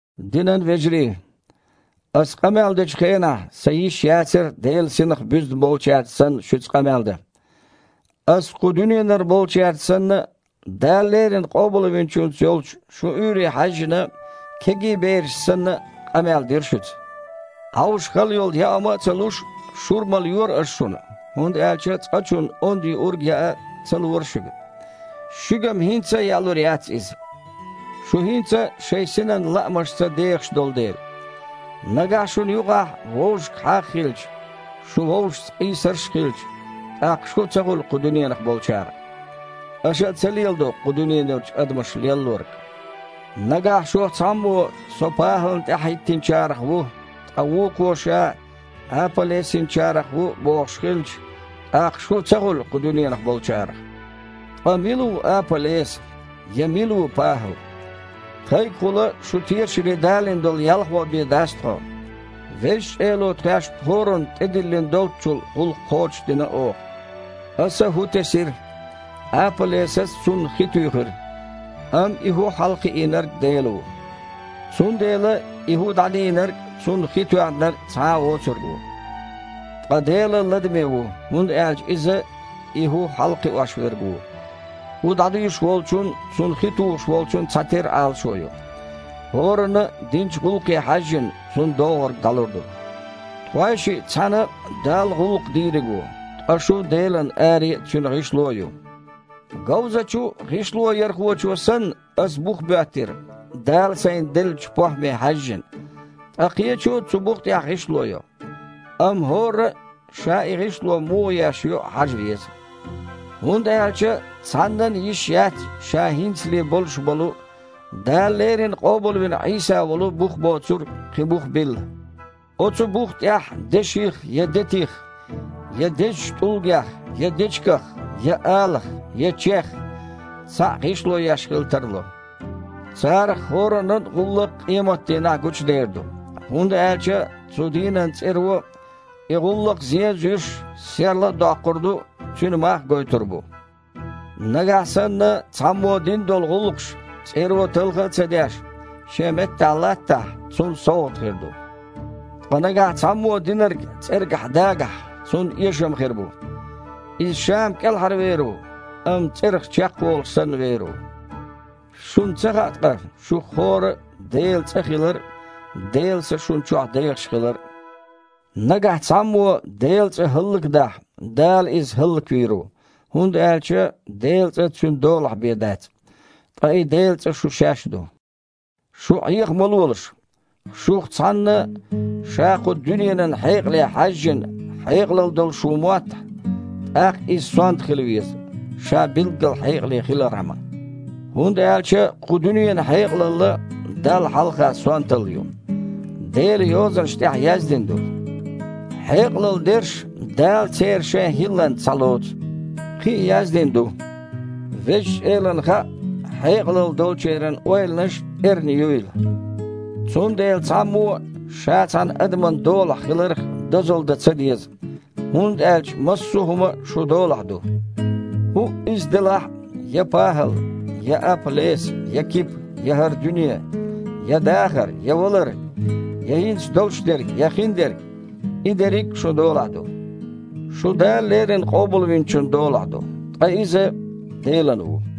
Динан вежарий, аса къамел дечу хенахь, сан йиш яцара Делан Синах буьзна болчаьрца санна шуьца къамел дан. Аса кху дуьненара болчаьрца санна а, Дала леррина Къобалвинчуьнца йолчу шун уьйре хьаьжжина, кегий берашца санна а къамел дира шуьца. Іовша хала йолу яа хІума а ца луш, шура малайора аса шуна, хІунда аьлча цкъачунна онда юург яа ца лора шуьга. Шуьга-м хІинца а яалур яц иза, шу хІинца а шайн синан лаамашца дехаш долу дела. Нагахь шуна юкъахь вовшашка хьагІ а хилча, шун вовшашца къийсарш а хилча, тІаккха шу а ца хуьлу кху дуьненах болчарах? Аша а ца леладо кху дуьненарчу адамаша леллорг? Нагахь шух цхьаммо «Со ПахІална тІаьхьахІиттинчарах ву», ткъа вукхо ша «Апа-Лесинчарах ву» бохуш хилча, тІаккха шу а ца хуьлу кху дуьненах болчарах? Ткъа мила ву Апа-Леса? Я мила ву ПахІал? Тхайгахула шу тешаре далийна долу ялхой бен дац тхо. Везачу Эло тхаьшна хІоранна тІедиллина доллучул гІуллакх кхочушдина оха. Аса хІу тесира, Апа-Лесас цунна хи туьйхира, амма и хІу хьалакхиийнарг Дела ву. Цундела и хІу дІадийнарг а, цунна хи тоьхнарг а цхьа а воцург ву. Ткъа Дела ладаме ву, хІунда аьлча Иза – и хІу хьалакхиош Верг ву. ХІу дІадуьйш волчун а, цунна хи тухуш волчун а цхьатерра Іалашо ю. ХІоранна а, динчу гІуллакхе хьаьжжина, цунна доггІург дІалур ду. Тхойшиъ цхьаьна Далла гІуллакх дийриг ву, ткъа шу Делан аре а, Цуьнан гІишло а ю. Говзачу гІишлоярхочо санна, аса бух боьттира, Дала сайна деллачу похІме хьаьжжина. Ткъа кхечо цу бух тІехь гІишло йо. Амма хІорра а ша и гІишло муха еш ю хьажа веза. ХІунда аьлча цхьаннан а йиш яц, ша хІинцале болуш болу, Дала леррина къобалвина Іийса волу бух боцург, кхин бух билла. Оцу бух тІехь деших, я детих, я дезачу тІулгех, я дечигах, я алах, я чех цхьаъ гІишло еш хила тарло. Царах хІораннан а гІуллакх къематдийнахь гучудер ду, хІунда аьлча цу дийнан цІеро и гІуллакх, зен а зуьйш, серла а доккхур ду, цуьнан мах а гойтур бу. Нагахь санна цхьаммо дина долу гІуллакхаш, цІеро талха а ца деш, шен меттахь латтахь, цунна совгІат хир ду. Ткъа нагахь цхьаммо динарг цІергахь дагахь, цунна эшам хир бу. Иза ша-м кІелхьарвер ву, амма цІерах чекхволуш санна вер ву. Шуна ца хаьа ткъа, шух хІорра а Делан цІа хилар а, Делан Са шуна чохь дехаш хилар а? Нагахь цхьаммо Делан цІа хІаллакдахь, Дала иза хІаллаквийр ву, хІунда аьлча Делан цІа Цуьнан долахь бен дац. Ткъа и Делан цІа шу шаьш ду. Шу Іеха ма лолаш. Шух цхьанна ша, кху дуьненан хьекъалалле хьаьжжина, хьекъалалла долуш ву моттахь, тІаккха иза «сонта» хила веза, ша билггал хьекъале хилархьама. ХІунда аьлча кху дуьненан хьекъалалла Далла хьалха «сонталла» ю. Делан Йозанаш тІехь яздина ду: «Хьекъалалла дерш Дала церан шайн хІилланца схьалоцу». Кхин а яздина ду: «Далла хаьа, хьекъалалла долчеран ойланаш эрна юйла». Цундела цхьаммо а ша цхьана адаман долахь хиларх дозалла дан ца деза, хІунда аьлча массо а хІума шун долахь ду, хІуъа а иза делахь а: я ПахІал, я Апа-Леса, я Кипа, я хІара дуьне, я дахар, я валар, я хІинца долуш дерг, я хиндерг. И дерриг а шун долахь ду. Шу Дала леррина Къобалвинчун долахь ду, ткъа Иза – Делан ву.